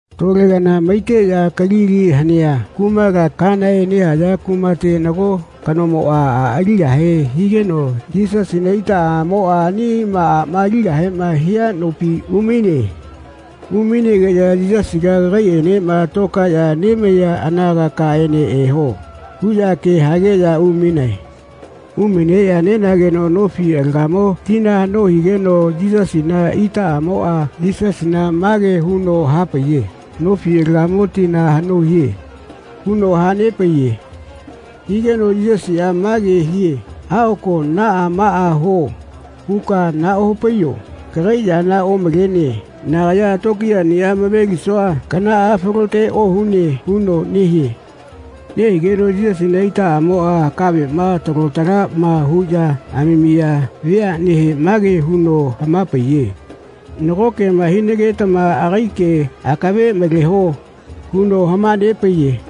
Tole kana maiteꞌya Kalili hanea kumala Kenae nehaya kumate nago kanomoꞌa a aligahe higeno Yisasina itaꞌamoꞌa anima aꞌma aligahema hia nopi umaine. Umainegeꞌya “Yisasiga kagaiꞌenema tokaeꞌya nemaiya anagakaene eho.” huꞌya ke hageꞌya umainae. Umaineꞌya nenageno nofi alagamo tina haꞌno higeno Yisasina itaꞌamoꞌa Yisasina mage huno hapaiye “Nofi alagamo tina haꞌno hie.” huno hanepaiye. Higeno Yisasiꞌa mage hie “Aꞌoko ‘Naꞌa maꞌa huo.’ huka nahaꞌopaiyo kagai yana omalene. nagaya tokiyaꞌniꞌa amavelisua kanaꞌa falote ohune.” huno nehie. Nehigeno Yisasina itaꞌamoꞌa kaveꞌma talo talaꞌma huꞌya amamiya veaꞌnehe mage huno hama-paiye “Nago kema hinagetama agai ke akave maleho.” huno hama-nepaiye.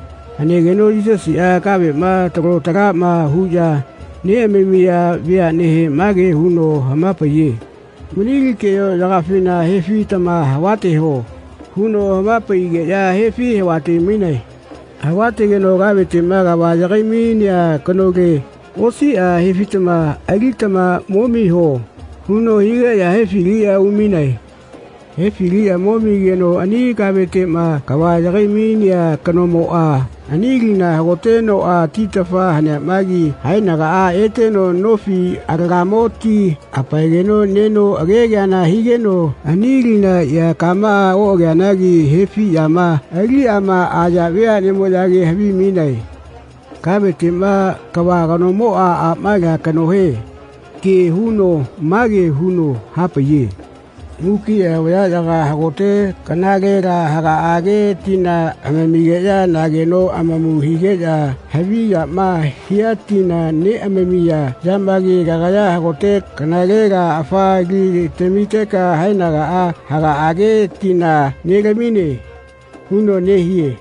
Hanegeno Yisasiꞌa kaveꞌma talo talaꞌma huꞌya neꞌamamiya veaꞌnehe mage huno hama-paiye “Mani li keꞌayoꞌyakafina hefitama havateho.” huno hama-paigeꞌya hefi havate-mainae. Havatageno “Kaveteꞌma kava yagai-mainea kanole osiꞌa hefitama alitama momiho.” huno higeꞌya hefiliꞌya umainae. Hefiliꞌya momigeno ani kaveteꞌma kava yagai-mainea kanomoꞌa ani lina hagotenoꞌa titafa haniamagi haenagaꞌa eteno nofi alagamo ti hapaegeno neno akekeana higeno ani lina ea kamaꞌa oꞌageneamagi hefiꞌyama aliꞌyaꞌma aya veaꞌnemoꞌyage havimainae. Kaveteꞌma kava kanomoꞌa aꞌma alia kanohe ke huno mage huno hapaiye. “Mukiꞌa vayaꞌyaga hagote kanalela hagaꞌage tina amamigeꞌya mageno amamu higeꞌya haviyama hia tina neꞌamamiya yamagi kagaya hagote kanalela afa li tamiteka haenaga hagaꞌage tina nelamine.” huno nehie.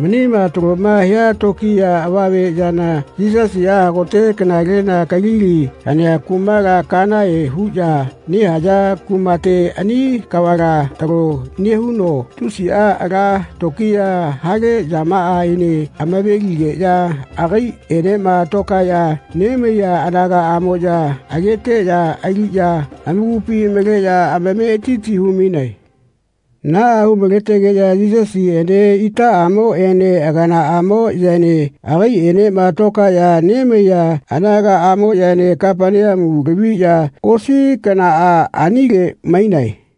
Manima taloma hia tokiya avame yana Yisasiꞌa hagote kanale Kalili hanea kumala Kenae huꞌya nehaya kumate ani kavala talo nehuno tusiꞌa ala tokiya hale yamaꞌaene amaveligeꞌya agaiꞌenema tokaeꞌya nemaiya anagaꞌamoꞌya ageteꞌya aliꞌya amakupi maleꞌya amametiti hu-mainae. Naꞌa hu-maletegeꞌya Yisasiꞌene itaꞌamoꞌene aganaꞌamoꞌyaene agaiꞌenema tokaeꞌya nemaiya anagaꞌamoꞌyaene Kapaneamu laviꞌya osi kanaꞌa anile mainae.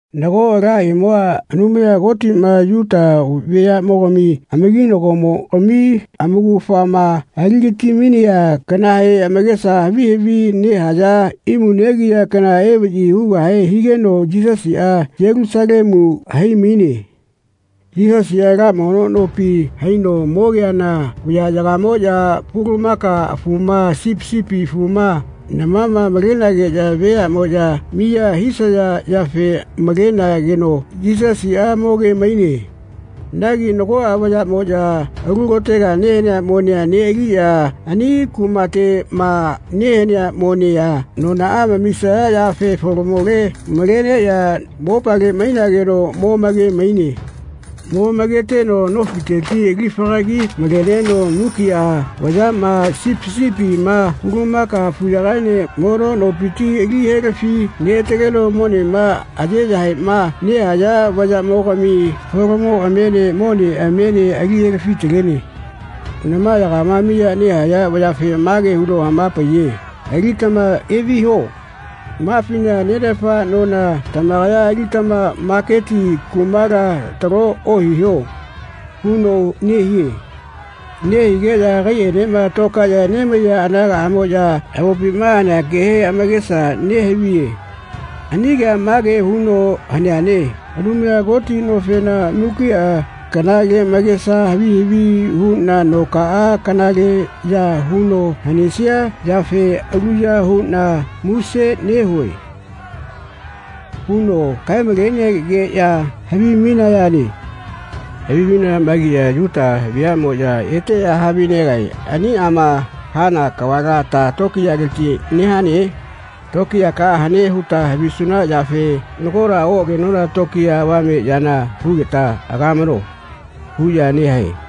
Nago ala imua Anumaya Kotiꞌma Yuta veayaꞌmogami amakinagomogami amaugafama aligatimainea kanahe amakesa havi havi nehaya imu negiya kana evaꞌyi hugahe higeno Yisasiꞌa Yelusalemu haimaine. Yisasiꞌa ala mono nopi haino mogeana vayaꞌyagamoꞌya pulumaka afuma sipi sipi afuma namama malenageꞌya veaꞌmoꞌya miya hisaya yafe malenageno Yisasiꞌa mokemaine. magi nagoꞌa vayaꞌmoꞌya alu kotega nehanea monea neꞌaliꞌya ani kumateꞌma nehanea monea anonaꞌa amamisaya yafe folomole maleꞌya mopale mainageno momakemaine. Momaketeno nofiteti alifagagi maleneno mukiꞌa vayaꞌma sipi sipima pulumaka afuyakaene mono nopiti ali helafi neꞌataleno monema ayeyahaeꞌma nehaya vayaꞌmogami folomoꞌamiene moneꞌamiene ali helafi-talene. Namayagama miya nehaya vayafe mage huno hamapaiye “Alitama eviho. Mafina nenafa nona tamakaya alitama maketi kumala talo ohiho.” huno nehie. Nehigeꞌya agaiꞌaenema tokaeꞌya nemaiya anagaꞌamoꞌya avopima hanea kehe amakesa nehaviye. Ani kea mage huno haneane “Anumaya Koti nofena mukiꞌa kanale magesa havi havi huꞌna nokaꞌa kanaleꞌya huno hanesia yafe aluya huꞌna muse nehue.” huno kaemalenegeꞌya havimainayane. Havimainayamagiꞌya Yuta vayaꞌmoꞌya eteꞌya havinegae “Aniꞌama hana kavala ta tokiyaleti nehane? Tokiyakaꞌa hane huta havisuna yafe nagola oꞌagenona tokiya avame yana hugeta agamano.” huꞌya nehae.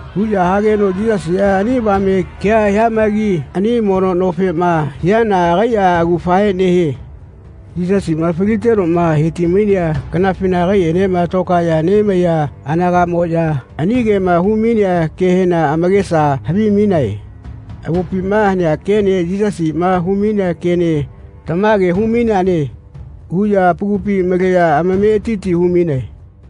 Huꞌya hageno Yisasiꞌa ani avame kea hiamagi ani mono nofema hiana agaiꞌa augafahe nehie. Yisasiꞌma falitenoꞌma he-ti-mainea kanafina agaiꞌenema tokaeꞌya nemaiya anagaꞌamoꞌya ani kema humainea kehena amakesa havimainae. Avopima hanea kene Yisasiꞌma humainea kene “Tamage humaineane.” huꞌya amakupi maleꞌya amametiti humainae.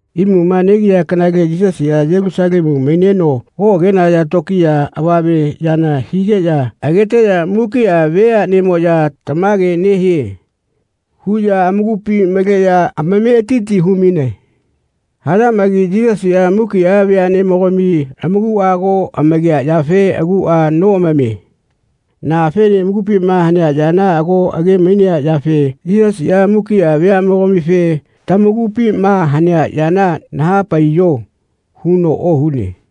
Imuma negiya kanale Yisasiꞌa Yelusalemu maineno oꞌagenaya tokiya avame yana higeꞌya ageteꞌya mukiꞌa veaꞌnemoꞌya “Tamage nehie.” huꞌya amakupi maleꞌya amametiti humainae. Hayamagi Yisasiꞌa mukiꞌa veaꞌnemogami amakuꞌa ago amakea yafe aguꞌa noꞌamamie. Naꞌafene amakupima hanea yana ago age-mainea yafe Yisasiꞌa mukiꞌa veaꞌmogamife “Tamakupima hanea yana naha-paiyo.” huno ohune.